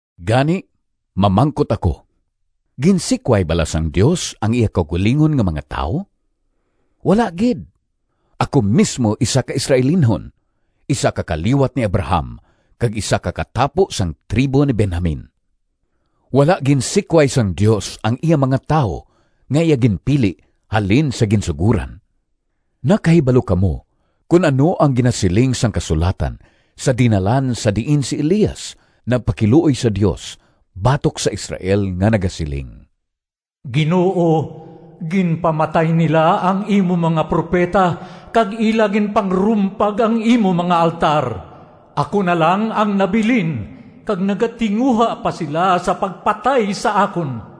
Gani, mamangkot ako: Ginsikway bala sang Dios ang iya kaugalingon nga mga tawo? Wala gid! Ako mismo isa ka Israelinhon, isa ka kaliwat ni Abraham, kag isa ka katapo sang tribo ni Benjamin. Wala ginsikway sang Dios ang iya mga tawo nga iya ginpili halin sa ginsugoran. Nakahibalo kamo kon ano ang ginasiling sang kasulatan sa dinalan sa diin si Elias nagpakiluoy sa Dios batok sa Israel nga nagasiling, “Ginoo, ginpamatay nila ang imo mga propeta kag ila ginpangrumpag ang imo mga altar. Ako na lang ang nabilin kag nagatinguha pa sila sa pagpatay sa akon.”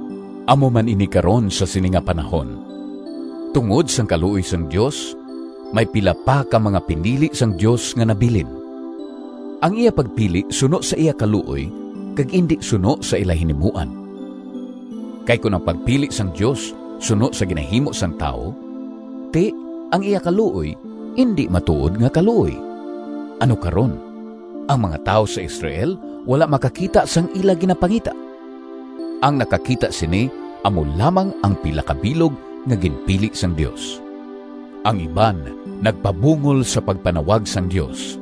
Amo man ini karon sa sini nga panahon: tungod sang kaluoy sang Dios, may pila pa ka mga pinili sang Dios nga nabilin. Ang iya pagpili suno sa iya kaluoy kag indi suno sa ila hinimuan. Kay kon ang pagpili sang Dios suno sa ginahimo sang tawo, ti, ang iya kaluoy indi matuod nga kaluoy. Ano karon? Ang mga tawo sa Israel wala makakita sang ila ginapangita. Ang nakakita sini amo lamang ang pila ka bilog nga ginpili sang Dios. Ang iban nagpabungol sa pagpanawag sang Dios.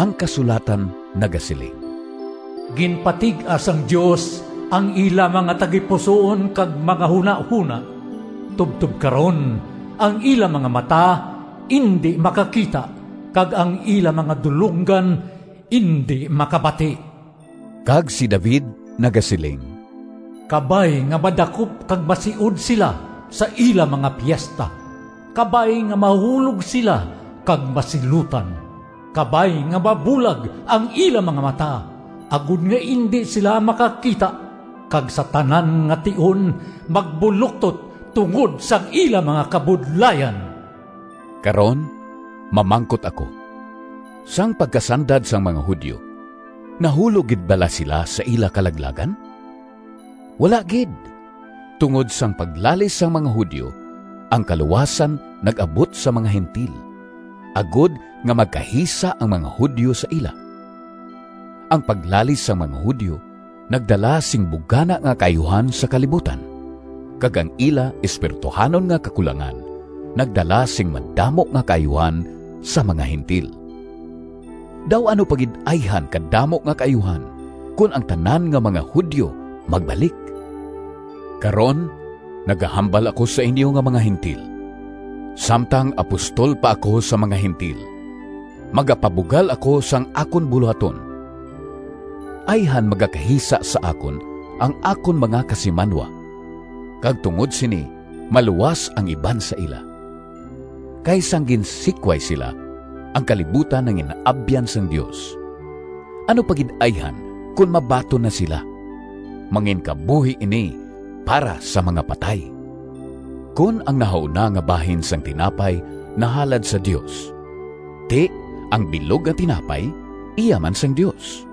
Ang kasulatan nagasiling, “Ginpatig-a sang Dios ang ila mga tagipusoon kag mga hunahona. Tubtob karon, ang ila mga mata indi makakita kag ang ila mga dulonggan indi makabati.” Kag si David nagasiling: “Kabay nga madakop kag masiod sila Sa ila mga piesta; Kabay nga mahulog sila Kag masilutan! Kabay nga mabulag ang ila mga mata, Agod nga indi sila makakita; Kag sa tanan nga tion magbuloktot Tungod sang ila mga kabudlayan.” Karon, mamangkot ako: Sang pagkasandad sang mga Judio, nahulog gid bala sila sa ila kalaglagan? Wala gid! Tungod sang paglalis sang mga Judio, ang kaluwasan nag-abot sa mga Gentil, agod nga magkahisa ang mga Judio sa ila. Ang paglalis sang mga Judio nagdala sing bugana nga kaayuhan sa kalibutan, kag ang ila espirituhanon nga kakulangan nagdala sing madamo nga kaayuhan sa mga Gentil. Daw ano pa gid ayhan kadamo nga kaayuhan kon ang tanan nga mga Judio magbalik! Karon nagahambal ako sa inyo nga mga Gentil: samtang apostol pa ako sa mga Gentil, magapabugal ako sang akon bulohaton. Ayhan magakahisa sa akon ang akon mga kasimanwa, kag tungod sini maluwas ang iban sa ila. Kay sang ginsikway sila, ang kalibutan nangin-abyan sang Dios. Ano pa gid ayhan kon mabaton na sila? Manginkabuhi ini para sa mga patay! Kon ang nahauna nga bahin sang tinapay nahalad sa Dios, ti, ang bilog nga tinapay iya man sang Dios;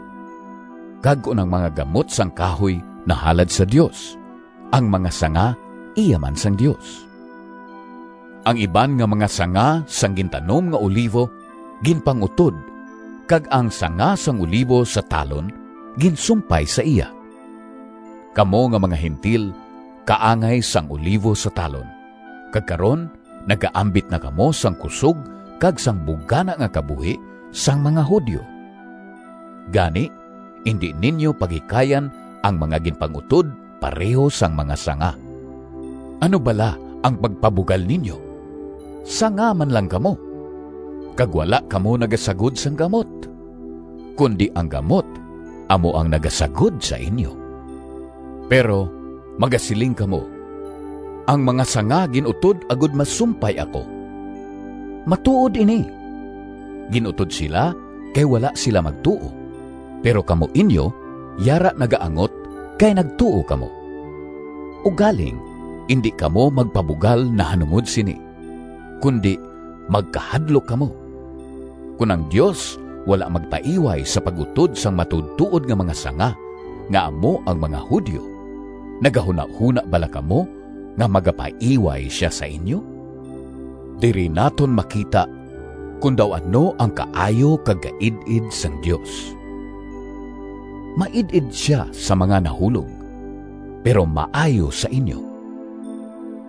kag kon ang mga gamot sang kahoy nahalad sa Dios, ang mga sanga iya man sang Dios. Ang iban nga mga sanga sang gintanom nga olivo ginpang-utod kag ang sanga sang olivo sa talon ginsumpay sa iya. Kamo nga mga Gentil kaangay sang olivo sa talon, kag karon nagaambit na kamo sang kusog kag sang bugana nga kabuhi sang mga Judio. Gani, indi ninyo paghikayan ang mga ginpang-utod pareho sang mga sanga. Ano bala ang pagpabugal ninyo? Sanga man lang kamo, kag wala kamo nagasagod sang gamot, kundi ang gamot amo ang nagasagod sa inyo. Pero magasiling kamo, “Ang mga sanga gin-utod agod masumpay ako.” Matuod ini! Gin-utod sila kay wala sila magtuo, pero kamo inyo yara nagaangot kay nagtuo kamo. Ugaling indi kamo magpabugal nahanungod sini, kundi magkahadlok kamo. Kon ang Dios wala magpaiway sa pag-utod sang matuodtuod nga mga sanga nga amo ang mga Judio, nagahunahona bala kamo nga magapaiway sia sa inyo? Diri naton makita kon daw ano ang kaayo kag kaid-id sang Dios. Maid-id sia sa mga nahulog, pero maayo sa inyo,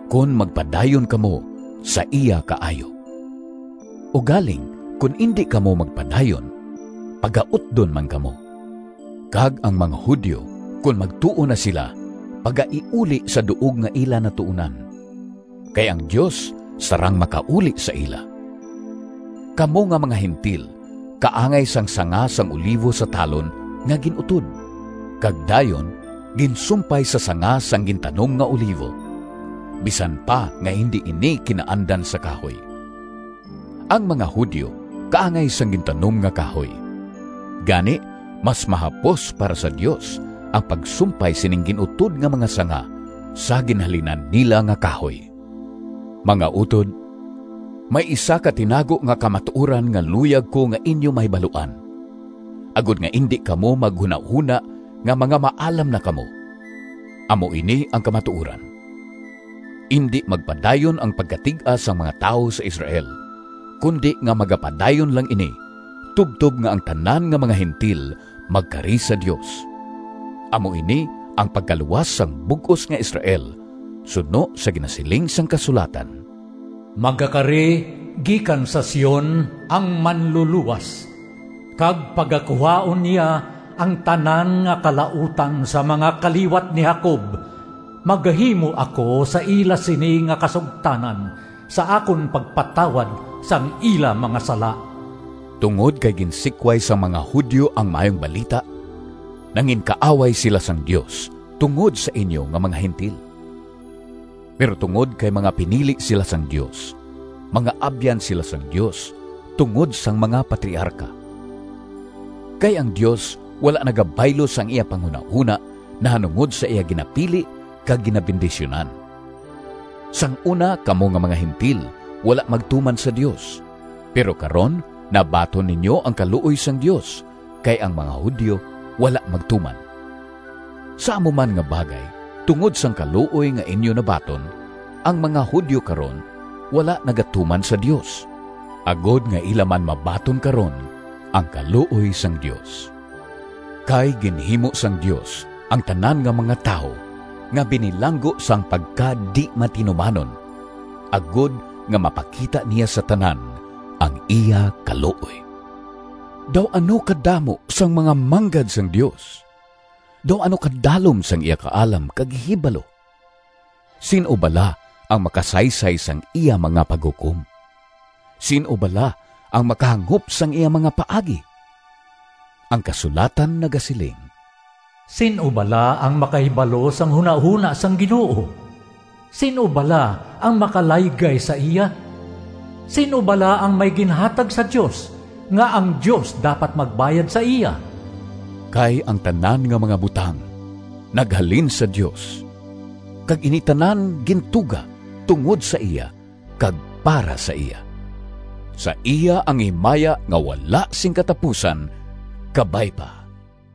kon magpadayon kamo sa iya kaayo. Ugaling kon indi kamo magpadayon, pagautdon man kamo. Kag ang mga Judio kon magtuo na sila pagaiuli sa duog nga ila natuonan, kay ang Dios sarang makauli sa ila. Kamo nga mga Gentil kaangay sang sanga sang olivo sa talon nga gin-utod, kag dayon ginsumpay sa sanga sang gintanom nga olivo, bisan pa nga indi ini kinaandan sa kahoy. Ang mga Judio kaangay sang gintanom nga kahoy. Gani, mas mahapos para sa Dios ang pagsumpay sining gin-utod nga mga sanga, sa ginhalinan nila nga kahoy. Mga utod, may isa ka tinago nga kamatuoran nga luyag ko nga inyo mahibaluan, agod nga indi kamo maghunahona nga mga maalam na kamo. Amo ini ang kamatuoran: indi magpadayon ang pagkatig-a sang mga tawo sa Israel, kundi nga magapadayon lang ini tubtob nga ang tanan nga mga Gentil magkari sa Dios. Amo ini ang pagkaluwas sang bug-os nga Israel suno sa ginasiling sang kasulatan: “Magakari gikan sa Sion Ang Manlulowas, Kag pagakuhaon niya Ang tanan nga kalautan Sa mga kaliwat ni Jacob. Magahimo ako sa ila Sini nga kasugtanan, Sa akon pagpatawad Sang ila mga sala.” Tungod kay ginsikway sang mga Judio ang Maayong Balita, nanginkaaway sila sang Dios tungod sa inyo nga mga Gentil. Pero tungod kay mga pinili sila sang Dios, mga abyan sila sang Dios tungod sang mga patriarka. Kay ang Dios wala nagabaylo sang iya panghunahona nahanungod sa iya ginapili kag ginabendisyunan. Sang una kamo nga mga Gentil wala magtuman sa Dios, pero karon nabaton ninyo ang kaluoy sang Dios kay ang mga Judio wala magtuman. Sa amo man nga bagay, tungod sang kaluoy nga inyo nabaton, ang mga Judio karon wala nagatuman sa Dios, agod nga ila man mabaton karon ang kaluoy sang Dios. Kay ginhimo sang Dios ang tanan nga mga tawo nga binilanggo sang pagkadi-matinumanon, agod nga mapakita niya sa tanan ang iya kaluoy. Daw ano kadamo sang mga manggad sang Dios! Daw ano kadalom sang iya kaalam kag ihibalo! Sin-o bala ang makasaysay sang iya mga paghukom? Sin-o bala ang makahangop sang iya mga paagi? Ang kasulatan nagasiling: “Sin-o bala ang makahibalo Sang hunahona sang Ginoo? Sin-o bala ang makalaygay sa iya? Sin-o bala ang may ginhatag sa Dios, Nga ang Dios dapat magbayad sa iya?” Kay ang tanan nga mga butang naghalin sa Dios, kag ini tanan gintuga tungod sa iya kag para sa iya—sa iya ang himaya nga wala sing katapusan! Kabay pa.